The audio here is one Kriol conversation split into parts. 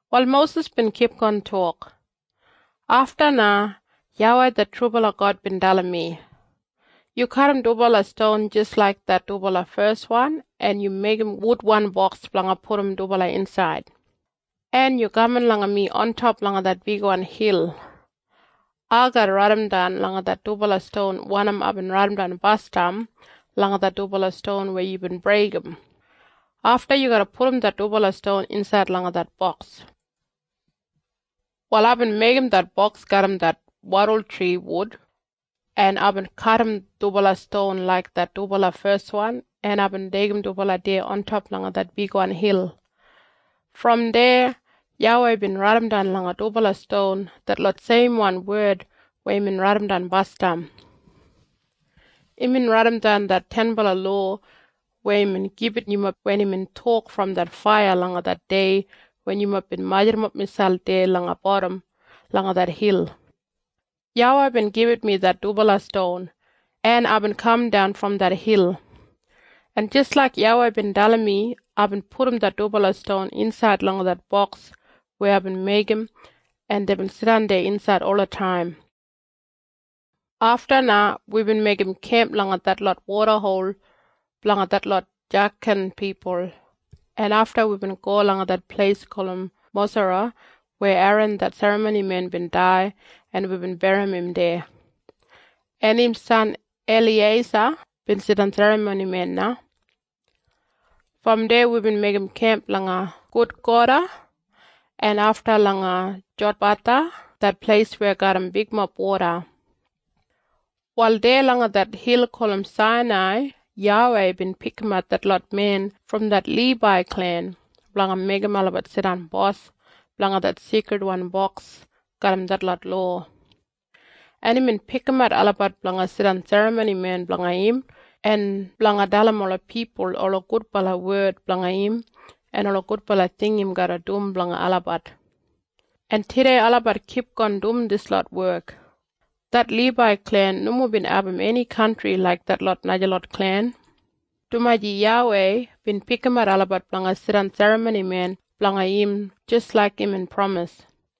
Wal Mosis bin kipgon tok, “Afta na YAWEI det trubala God bin dalim mi, ‘Yu kadim dubala ston jis laik det dubala feswan en yu meigim wudwan boks blanga pudum dubala insaid. En yu kaman langa mi ontop langa det bigwan hil. Ai garra raidimdan langa det dubala ston wanim aibin raidimdan basdam langa det dubala ston weya yubin breigim. Afta yu garra pudum det dubala ston insaid langa det boks.’ “Wal aibin meigim det boks garram det wadultri wud en aibin kadim dubala ston laik det dubala feswan en aibin deigim dubala deya ontop langa det bigwan hil. Brom deya YAWEI bin raidimdan langa dubala ston detlot seimwan wed weya imbin raidimdan basdam. Imbin raidimdan det tenbala lowa weya imbin gibit yumob wen imbin tok brom det faiya langa det dei wen yumob bin majurrumap miselp deya langa bodam langa det hil. YAWEI bin gibit mi det dubala ston, en aibin kamdan brom det hil. En jis laik YAWEI bin dalim mi aibin pudum det dubala ston insaid langa det boks weya aibin meigim en deibin jidan deya insaid olataim. “Afta na wibin meigim kemp langa detlot wodahol blanga detlot Jakan pipul en afta wibin go langa det pleis gulum Mosara weya Eran det serramonimen bin dai en wibin berrim im deya. En im san Eliyeisa bin jidan serramonimen na. Brom deya wibin meigim kemp langa Gudgoda en afta langa Jotbatha det pleis weya garram bigmob woda. “Wal deya langa det hil gulum Sainai YAWEI bin pikimat detlot men brom det Libai klen blanga meigim olabat jidan bos blanga det Seikridwan Boks garram detlot lowa. En imbin pikimat olabat blanga jidan serramonimen blanga im en blanga dalim ola pipul ola gudbala wed blanga im en ola gudbala ting im garra dum blanga olabat. En tudei olabat kipgon dum dislot wek. Det Libai klen nomo bin abum eni kantri laik detlot najalot klen, dumaji YAWEI bin pikimat olabat blanga jidan serramonimen blanga im jis laik imbin pramis.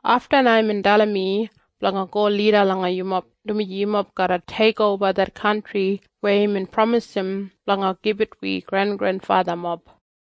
Afta na imbin dalim mi blanga go lida langa yumob dumaji yumob garra teikoba det kantri weya imbin pramisim blanga gibit wi grengrenfathamob.”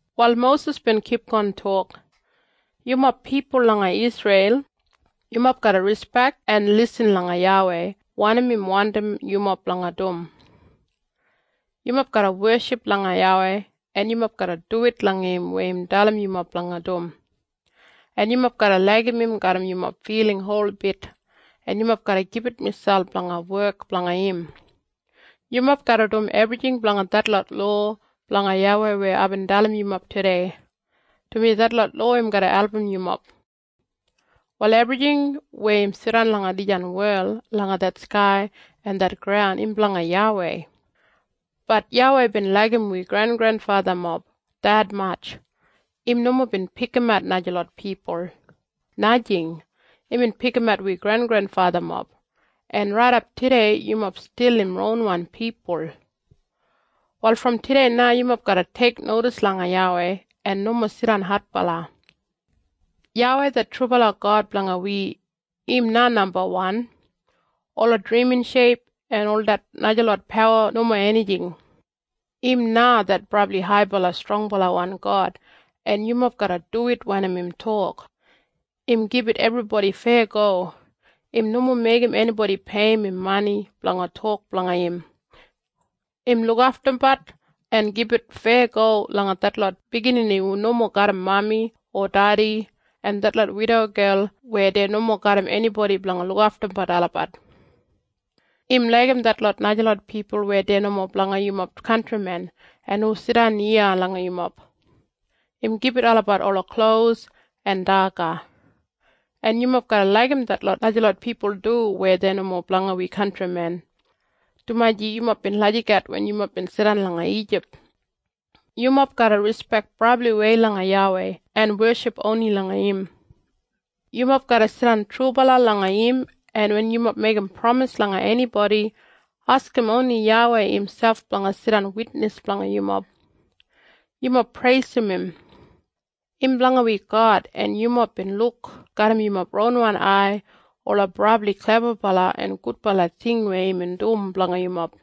Wal Mosis bin kipgon tok, “Yumob pipul langa Isreil, yumob garra rispek en lisin langa YAWEI wanim im wandim yumob blanga dum. Yumob garra weship langa YAWEI en yumob garra duwit langa im weya im dalim yumob blanga dum. En yumob garra laigim im garram yumob filing holbit en yumob garra gibit miselp blanga wek blanga im. Yumob garra dum ebrijing blanga detlot lowa blanga YAWEI weya aibin dalimbat yumob tudei, dumaji detlot lowa im garra album yumob. “Wal ebrijing weya im jidan langa dijan wel langa det skai en det graun im blanga YAWEI. Bat YAWEI bin laigim wi grengrenfathamob detmatj, im nomo bin pikimat najalot pipul. Najing! Imbin pikimat wi grengrenfathamob, en raidap tudei yumob stil im ronwan pipul. Wal brom tudei na yumob garra teiknodis langa YAWEI en nomo jidan adbala. YAWEI det trubala God blanga wi, im na nambawan. Ola drimin sheip en ol det najalot pawa nomo enijing. Im na det brabli haibala strongbalawan God en yumob garra duwit wanim im tok. Im gibit ebribodi feyago. Im nomo meigim enibodi peiyim im mani blanga tok blanga im. Im lukaftumbat en gibit feyago langa detlot biginini hu nomo garram mami o dedi, en detlot widogel weya dei nomo garram enibodi blanga lukaftumbat olabat. Im laigim detlot najalot pipul weya dei nomo blanga yumob kantrimen en hu jidan iya langa yumob. Im gibit olabat ola klos en daga. En yumob garra laigim detlot najalot pipul du weya dei nomo blanga wi kantrimen, dumaji yumob bin lagijat wen yumob bin jidan langa Ijip. Yumob garra rispek brabliwei langa YAWEI en weship oni langa im. Yumob garra jidan trubala langa im en wen yumob meigim pramis langa enibodi, askim oni YAWEI imselp blanga jidan witnis blanga yumob. Yumob preisim im. Im blanga wi God en yumob bin luk garram yumob ronwan ai ola brabli klebabala en gudbala ting weya imbin dum blanga yumob.